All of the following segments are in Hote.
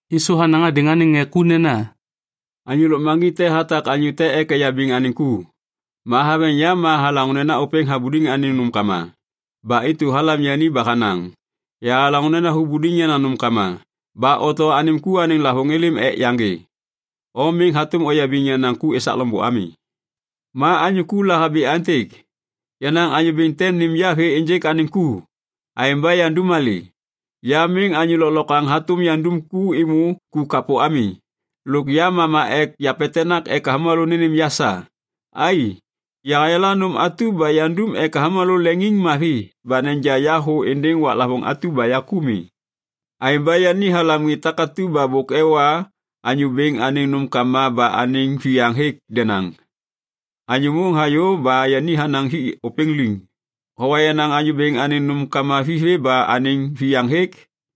Yisu hanaŋ hadêŋ anêŋ ŋê ku nena, “Anyô lôkmaŋgiŋ te hatak anyô te ek eyabiŋ anêŋ ku. Ma haveŋ yam ma halaŋô nena ôpêŋ habuliŋ anêŋ nômkama. Ba intu halam yani ba hanaŋ, ‘Yahalaŋô nena hubuliŋ yenaŋ nômkama. Ba oto anêm ku anêŋ lavôŋ êlêm ek yaŋgê. O miŋ hatôm oyabiŋ yenaŋ ku esak loŋbô ami.’ “Ma anyô ku lahabi aêntêk, ‘Yenaŋ anyô bêŋ tem nêm ya vê ênjêk anêŋ ku, aêŋ ba yandum malê. Ya miŋ anyô lôklokwaŋ hatôm yandum ku êmô ku kapô ami. Lôk ya mama ek yapetenak ek avômalô nênêm ya sa. Ai! Yahayala nôm atu ba yandum ek avômalô leŋiŋmavi ba neja ya thô êndêŋ waklavôŋ atu ba ya ku mi.’ “Aêŋ ba yani halam ŋê takatu ba bôk ewa anyô bêŋ anêŋ nômkama ba anêŋ viyaŋ hêk denaŋ. Anyô môŋ hayô ba yani hanaŋ hik ôpêŋ liŋ, ‘Howa yenaŋ anyô bêŋ anêŋ nômkama vithê ba anêŋ viyaŋ hêk?’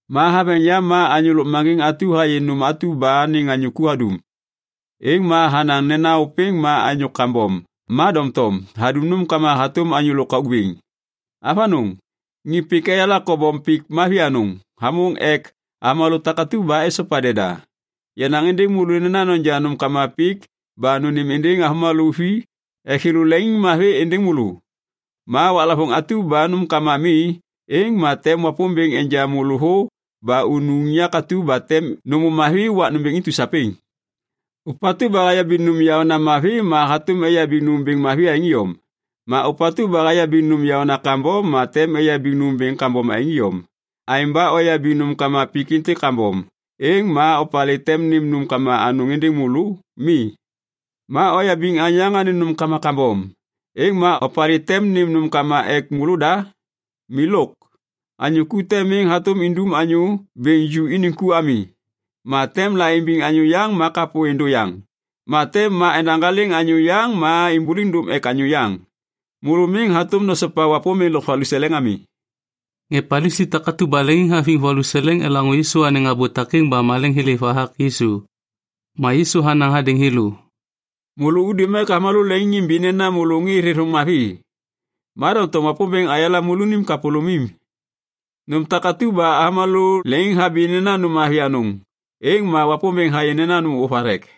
“Ma haveŋ yam ma anyô lôkmaŋgiŋ atu hayê nôm atu ba anêŋ anyô ku hadum. Êŋ ma hanaŋ nena ôpêŋ ma anyô kambom ma doŋtom hadum nômkama hatôm anyô lôkauk bêŋ. Avanôŋ, ŋê pik eyala kobom pik mavi anôŋ hamôŋ ek avômalô takatu ba esopa deda. “Yanaŋ êndêŋ môlô nena noja nômkama pik ba nônêm êndêŋ avômalô vi ek thêlô leŋiŋmavi êndêŋ môlô. Ma waklavôŋ atu ba nômkama mi, êŋ ma tem Wapômbêŋ enja môlô thô ba unu unyak atu ba tem nômô mavi wak nômbêŋ intu sapêŋ. “Ôpatu ba hayabiŋ nôm yaônena mavi ma hatôm eyabiŋ nômbêŋ mavi aêŋ iyom. Ma ôpatu ba hayabiŋ nôm yaônena kambom ma tem eyabiŋ nômbêŋ kambom aêŋ iyom. Aêŋ ba oyabiŋ nômkama pik êntêk kambom, êŋ ma opalê tem nêm nômkama anôŋ êndêŋ môlô? Mi. Ma oyabiŋ anyô yaŋ anêŋ nômkama kambom, êŋ ma opalê tem nêm nômkama ek môlôda? Milôk. “Anyô ku te miŋ hatôm indum anyô bêŋ ju iniŋ ku ami. Ma tem la imbiŋ anyô yaŋ ma kapô êndô yaŋ. Ma tem ma endahaliŋ anyô yaŋ ma imbuliŋ dôm ek anyô yaŋ. Môlô miŋ hatôm nosopa Wapômbêŋ lôk valuseleŋ ami.” Ŋê Palisi takatu ba leŋiŋhaviŋ valuseleŋ elaŋô Yisu anêŋ abô takêŋ ba maleŋ thêlêv hathak Yisu. Ma Yisu hanaŋ hadêŋ thêlô, “Môlô udum ek avômalô leŋiŋimbi nena môlô ŋê thêthôŋ mavi. Ma doŋtom Wapômbêŋ hayala môlônim kapôlômim. Nôm takatu ba avômalô leŋiŋhabi nena nôm mavi anôŋ, êŋ ma Wapômbêŋ hayê nena nôm ôvathek.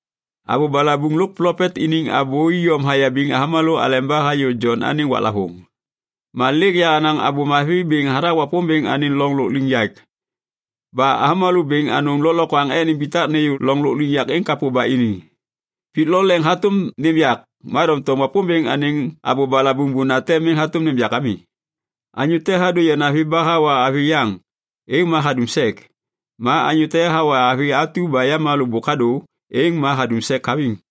“Abô balabuŋ lôk plopet iniŋ abô iyom hayabiŋ avômalô aleba hayô Jon anêŋ waklavôŋ. Ma lêk yahanaŋ Abô Mavi bêŋ hathak Wapômbêŋ anêŋ loŋ lôkliŋyak. Ba avômalô bêŋ anôŋ lôklokwaŋ ek nimbitak nêyô loŋ lôkliŋyak êŋ kapô ba ini. Pik lo leŋ hatôm nêm yak. Ma doŋtom Wapômbêŋ anêŋ abô balabuŋ bunate miŋ hatôm nêm yak ami. “Anyô te hadô yanavi ba hawa avi yaŋ, êŋ ma hadum sek. Ma anyô te hawa avi atu ba yamalô bôk hadô, êŋ ma hadum sek haviŋ.”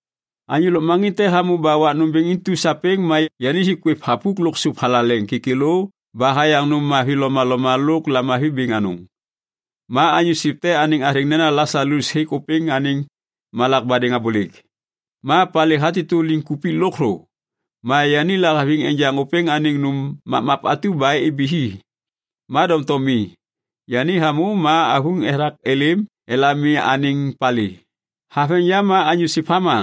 “Anyô lôkmaŋgiŋ te hamô ba wak nômbêŋ intu sapêŋ ma yani hik kwêv thapuk lo sôp thalaleŋ kêkêlô ba hayaŋ nôm mavi lomaloma lôk lamavi bêŋ anôŋ. Ma anyô siv te anêŋ athêŋ nena Lasalus hêk ôpêŋ anêŋ malak badêŋ abôlêk. Ma palê hatêtô liŋkupik lôkthô. Ma yani lahaviŋ enjaŋ ôpêŋ anêŋ nôm mapmap atu ba ibi hi, ma doŋtom mi. Yani hamô ma avuŋ ethak êlêm elami anêŋ palê. “Haveŋ yam ma anyô siv hama,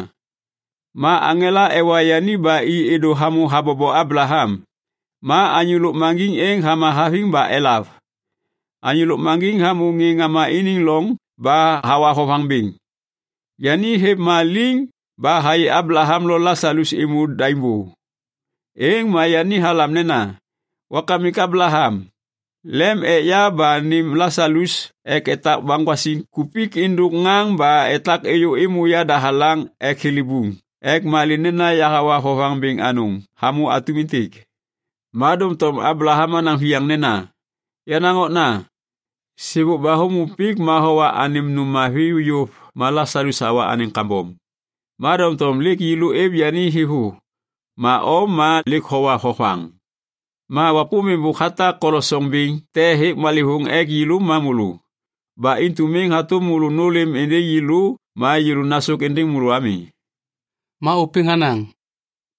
ma aŋela ewa yani ba i êdô hamô habobo Ablaham. Ma anyô lôkmaŋgiŋ êŋ hama haviŋ ba elav. Anyô lôkmaŋgiŋ hamô ŋê ŋama iniŋ loŋ ba hawa vovaŋ bêŋ. Yani hêv ma liŋ ba hayê Ablaham lo Lasalus êmô daim bô. Êŋ ma yani halam nena, ‘Wakamik Ablaham, lem ek ya ba nêm Lasalus ek etak baŋgwasiŋ kupik êndôk ŋaŋ ba etak êyô êmô yadahalaŋ ek thilibuŋ ek malê nena yahawa vovaŋ bêŋ anôŋ hamô atum êntêk.’ “Ma doŋtom Ablaham hanaŋ viyaŋ nena, ‘Yenaŋ okna, sêbôk ba hômô pik ma howa anêm nôm mavi yôv ma Lasalus hawa anêŋ kambom. Ma doŋtom lêk yêlô êv yani thêvô ma o ma lêk howa vovaŋ. Ma Wapômbêŋ bôk hatak kolosoŋ bêŋ te hêk malêvôŋ ek yêlô ma môlô. Ba intu miŋ hatôm môlô nôlêm êndêŋ yêlô ma yêlô nasôk êndêŋ môlô ami.’ “Ma ôpêŋ hanaŋ,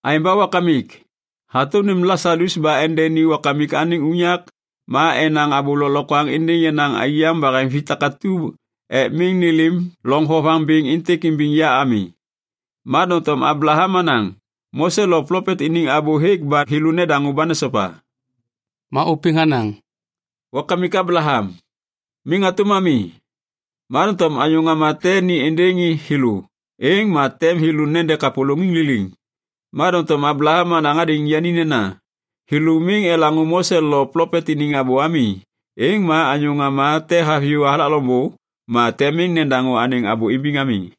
‘Aêŋ ba wakamik, hatôm nêm Lasalus ba endeni wakamik anêŋ unyak ma enaŋ abô lôklokwaŋ êndêŋ yenaŋ aiyaŋ baheŋvi takatu ek miŋ nêlêm loŋ vovaŋ bêŋ êntêk imbiŋ ya ami.’ “Ma doŋtom Ablaham hanaŋ, ‘Mose lo plopet iniŋ abô hêk ba thêlô nedaŋô ba nesopa.’ “Ma ôpêŋ hanaŋ, ‘Wakamik Ablaham, miŋ hatôm ami. Ma doŋtom anyô ŋama te ni êndêŋ thêlô, êŋ ma tem thêlô nede kapôlôŋiŋ liliŋ.’ “Ma doŋtom Ablaham hanaŋ hadêŋ yani nena, ‘Thêlô miŋ elaŋô Mose lo plopet iniŋ abô ami. Êŋ ma anyô ŋama te haviyô hathak loŋbô, ma tem miŋ nedaŋô anêŋ abô imbiŋ ami.’”